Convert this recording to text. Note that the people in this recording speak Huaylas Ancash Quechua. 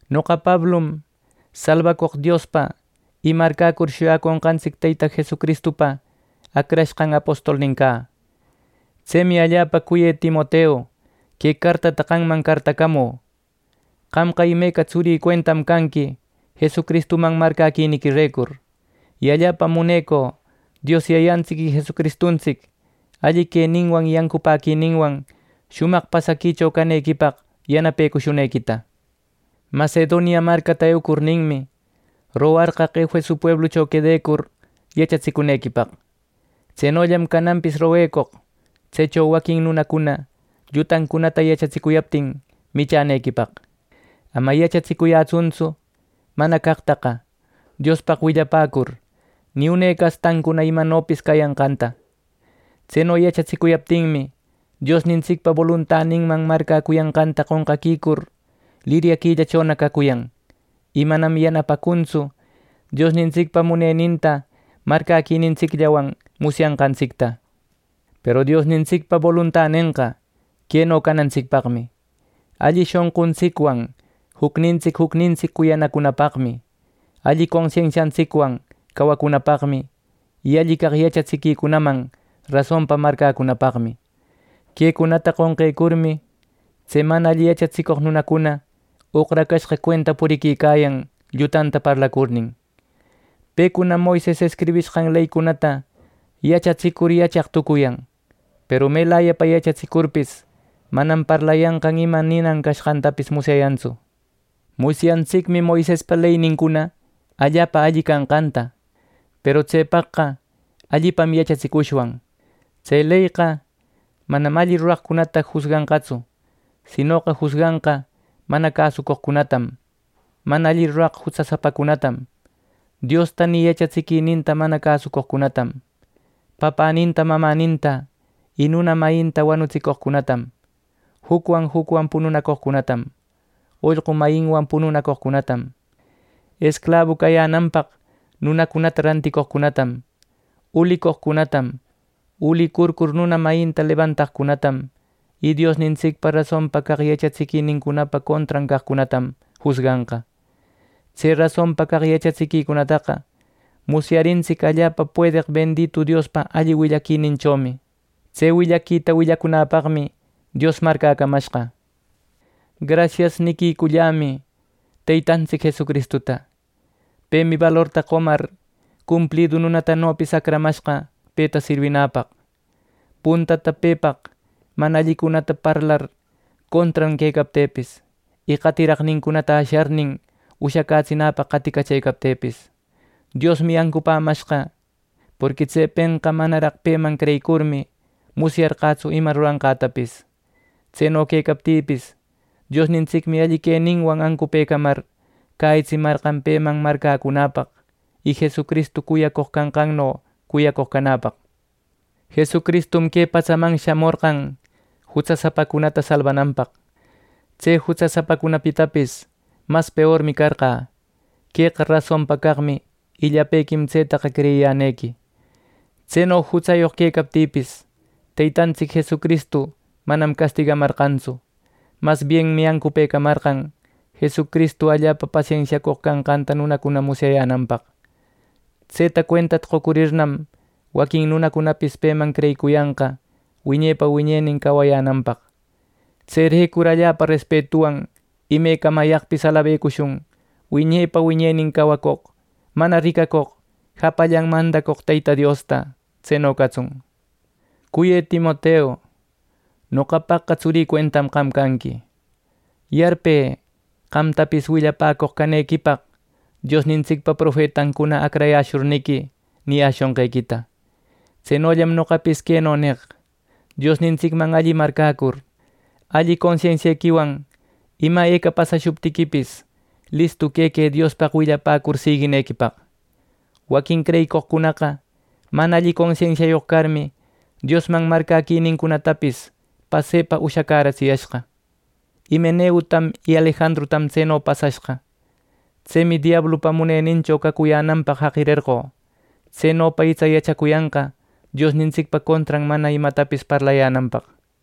Noqa Pablum, salbacoq Diospa, y marcäcur shuyaconqantsic Teyta Jesucristupa acrashqan apostolnin cä. Tsemi, allapa cuyë Timoteu, que cartata qamman cartacamü. Qamqa imeca tsurï cuentam canqui Jesucristuman marcäquiniquirecur. Y allapam munecü Dios Yayantsic y Jesucristuntsic alli queninwan y ancupäquininwan shumaq pasaquicho canequipaq yanapecushunequita. Macedonia marcata eucurninmi, rogarqaq Efeso pueblucho quedecur yachatsicunequipaq. Tsenollam cananpis roguecoq tsecho waquin nunacuna llutancunata yachatsicuyaptin michänequipaq. Ama yachatsicuyätsuntsu mana caqtaqa Diospaq willapäcur, ni une castancuna imanopis cayanqanta. Tseno yachatsicuyaptinmi, Diosnintsicpa boluntaninman marcäcuyanqanta qonqaquicur liryaquillachona cacuyan, y manam yanapacuntsu Diosnintsicpa muneninta marcäquinintsicllawan musyanqantsicta. Peru Diosnintsicpa boluntanenqa queno canantsicpaqmi: alli shonquntsicwan jucnintsic jucnintsic cuyanacunapaqmi, alli consensiantsicwan cawacunapaqmi, y alli caq yachatsiquicunaman rasonpa marcäcunapaqmi. Quecunata qonqecurmi, tse mana alli yachatsicoq nunacuna oqracashqa cuenta puriquicayan llutanta parlacurnin. Pecunam Moises escribishqan leycunata yachatsicur, yachaq tucuyan; peru melayapa yachatsicurpis, manam parlayanqan ni ima ninan canqantapis musyayantsu. Musyantsicmi Moisespa leynincuna allapa alli canqanta, peru tsepaqqa allipam yachatsishwan. Tse leyqa manam alli ruraqcunata jusganqatsu; sinoqa jusganqa mana cäsucoqcunatam, mana alli ruraq jutsasapacunatam, Diosta ni yachatsiquininta mana cäsucoqcunatam, papäninta, mamäninta, y nuna mayinta wanutsicoqcunatam, jucwan jucwan pununacoqcunatam, ollqu mayinwan pununacoqcunatam, esclabu cayänanpaq nunacunata ranticoqcunatam, ulicoqcunatam, ulicurcur nuna mayinta lebantaqcunatam y Diosnintsicpa rasonpa caq yachatsiquinincunapa contran caqcunatam jusganqa. Tse rasonpa caq yachatsiquicunataqa musyarintsic allapa puedeq benditu Diospa alli willaquininchomi. Tse willaquita willacunäpaqmi Dios marcäcamashqa. “Grasias” niquicullämi Teytantsic Jesucristuta. Pemi balorta qomar, cumplidu nunatanopis acramashqa peta sirwinäpaq. Puntata pepaq mana allicunata parlar contran quecaptïpis, y qatiraqnincunata asharnin ushacätsinäpaq qaticachëcaptïpis, Diosmi ancupämashqa; porqui tsepenqa manaraq peman creyicurmi, musyarqätsu ima ruranqätapis. Tseno quecaptïpis, Diosnintsicmi alli queninwan ancupëcamar cäyitsimarqan peman marcäcunäpaq, y Jesucristu cuyacoq canqanno cuyacoq canäpaq. Jesucristum que patsaman shamorqan jutsasapacunata salbananpaq. Tse jutsasapacunapitapis mas peormi carqä. Queqa rasonpa caqmi, y llapequim tsetaqa creyiyänequi. Tseno jutsayoq quecaptïpis, Teytantsic Jesucristu manam castigamarqantsu. Mas bienmi ancupëcamarqan Jesucristu allapa pasensiacoq canqanta nunacuna musyayänanpaq. Tseta cuentata qocurirnam, waquin nunacunapis peman creyicuyanqa wiñepa wiñenin cawayänanpaq. ¡Tserecur allapa respetuwan imecamayaqpis alabecushun wiñepa wiñenin cawacoq, mana ricacoq, japallan mandacoq Teyta Diosta! ¡Tseno catsun! Cuyë Timoteu, noqapaqqa tsurï cuentam qam canqui. Yarpë qamtapis willapäcoq canequipaq Diosnintsicpa profetancuna acrayäshurniqui niyäshonqequita. Tsenollam noqapis queno neq: Diosnintsicman alli marcäcur, alli consensiequiwan ima eca pasashuptiquipis, listu quequë Diospaq willacur siguinequipaq. Waquin creyicoqcunaqa mana alli consensiayoq carmi, Diosman marcäquinincunatapis pasepa ushacäratsiyashqa. Himeneutam y Alejandrutam tseno pasashqa. Tsemi diablupa munenincho cacuyänanpaq jaqirerqö, tsenopa itsa yachacuyanqa Diosnintsicpa contran mana imatapis parlayänanpaq.